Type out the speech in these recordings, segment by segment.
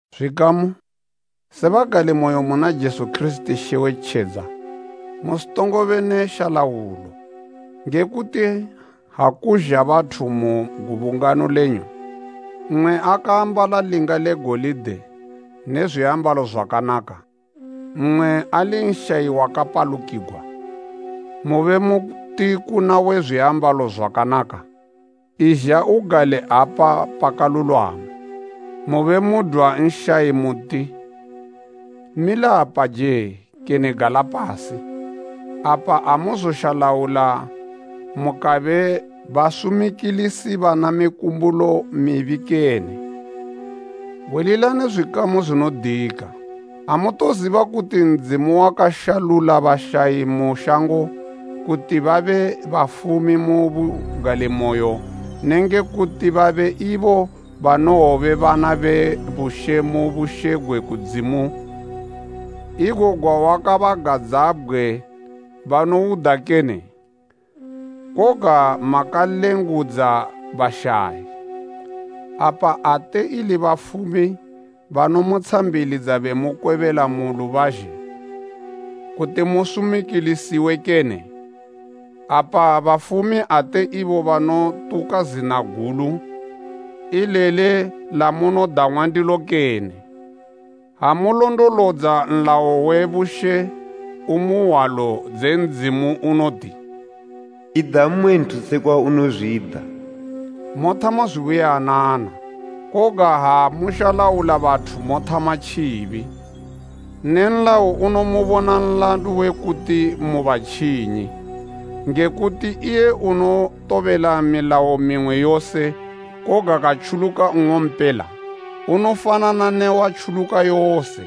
Zwikamu, se bagalimoyo muna Jesu Kirisiti She we tjedza, musitongobe ne shalaulo. Nge kuti ha kuzha bathu mu gubungano lenyu, mmwe akaambala linga le golide ne zwiambalo zwakanaka, mmwe ali nshayi wakapalukigwa, mube muti kuna we zwiambalo zwakanaka, “Izha ugale apa pakalulwama,” mube mudwa nshayi muti, “Mila apaje,” kene “Gala pasi,” apa amuzoshalaula mukabe basumikilisi bana mikumbulo mibi kene? Hwililani zwikamu zwinodika. Amutoziba kuti Ndzimu wakashalula bashayi mu shango kuti babe bafumi mu bugalimoyo nenge kuti babe ibo banowobe bana be bushe mu bushe gwe kudzimu, igo gwawakabagadzabgwe banouda kene? Koga makalengudza bashayi. Apa ate ili bafumi banomutshambilidza bemukwebela mu lubazhe kuti musumikilisiwe kene? Apa bafumi ate ibo banotuka zina gulu, ileli lamunodang'wa ndilo kene? Ha mulondolodza nlayo we bushe umu hwalo dze Ndzimu unoti, “Ida mmwe nthu sekwa unozwida,” mothama zubuyanana. Koga ha mushalaula bathu mothama tjibi, ne nlayo unomubona nlandu we kuti mu batjinyi. Nge kuti iye unotobela milayo mimwe yose koga katjuluka nng'ompela, unofanana ne watjuluka yose.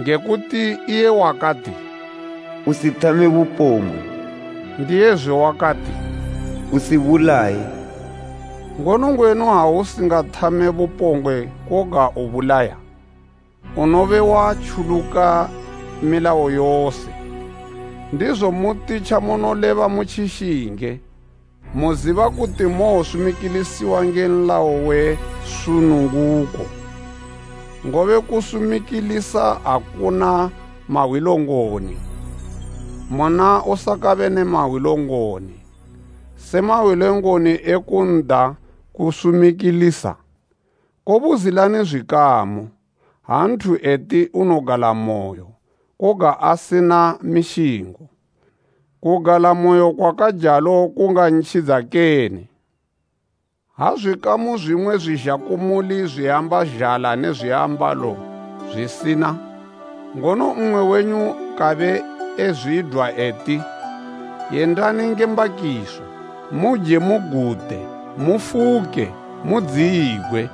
Nge kuti iye wakati, “Usi thame bupombgwe,” ndiyezwe wakati, “Usibulaye.” Ngono ngwenu ha usingathame bupombgwe koga ubulaya, unobe watjuluka milayo yose. Ndizo muti tjamunoleba mutjishinge, muziba kuti mowosumikilisiwa nge nlayo we sununguko. Ngobe kusumilikisa akuna mahwilongoni muna usakabe ne mahwilongoni, se mahwilongoni e kunda kusumikilisa. Kobuzilani zwikamu, ha nthu eti unogalamoyo, koga asina mishingo? Kugalamoyo kwakajalo kungantjidza kene? Ha zwikamu, zwimwe zwizha kumuli zwiamba zhala ne zwiambalo zwisina, ngono mmwe wenyu kabe ezwidwa eti, “Yendani nge mbakiso, muje mugute, mufuke mudziyigwe,”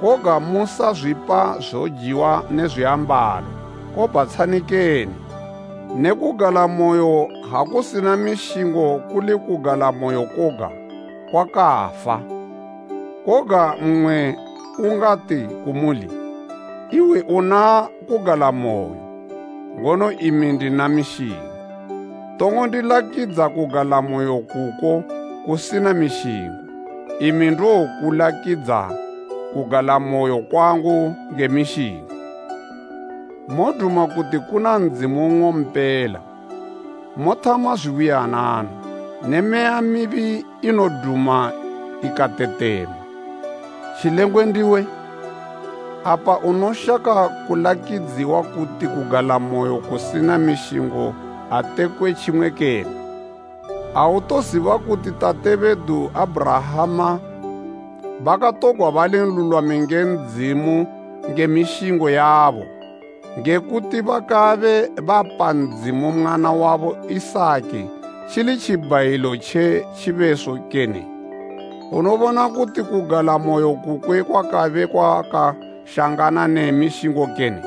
koga musazwipa zojiwa ne zwiambalo, kobhatshani kene? Ne kugalamoyo ha kusina mishingo, kuli kugalamoyo koga, kwakafa. Koga mmwe ungati kumuli, “Iwe una kugalamoyo, ngono imi ndina mishingo.” Tongo ndilakidza kugalamoyo kuko kusina mishingo, imi ndowokulakidza kugalamoyo kwangu nge mishingo. Moduma kuti kuna Ndzimu nng'ompela, mothama zubuyanana. Ne meya mibi inoduma, ika tetema. Tjilengwe ndiwe! Apa unoshaka kulakidziwa kuti kugalamoyo kusina mishingo aatekwe tjimwe kene? Autoziba kuti tate bedu Abhurahama bakatogwa balinlulwami nge Ndzimu nge mishingo yabo, nge kuti bakabe bapa Ndzimu mwana wabo Isaki, tjili tjibhayilo mu tjibeso tjinopisigwa zwibhayilo kene? Unobona kuti kugalamoyo kukwe kwakabe kwakashangana ne mishingo kene?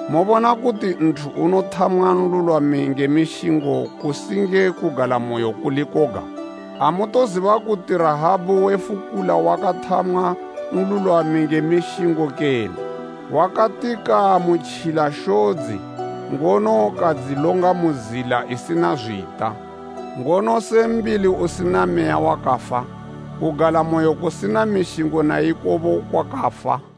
Mobona kuti nthu unothamwa nlulwami nge mishingo kusi nge kugalamoyo kuli koga? Amutoziba kuti Rahabu we fukula wakathamwa nlulwami nge mishingo kene? Wakati kaamutjila shodzi, ngono kadzilonga mu zila isina zwita. Ngono se mbili usina meya wakafa, kugalamoyo kusina mishingo na ikobo kwakafa.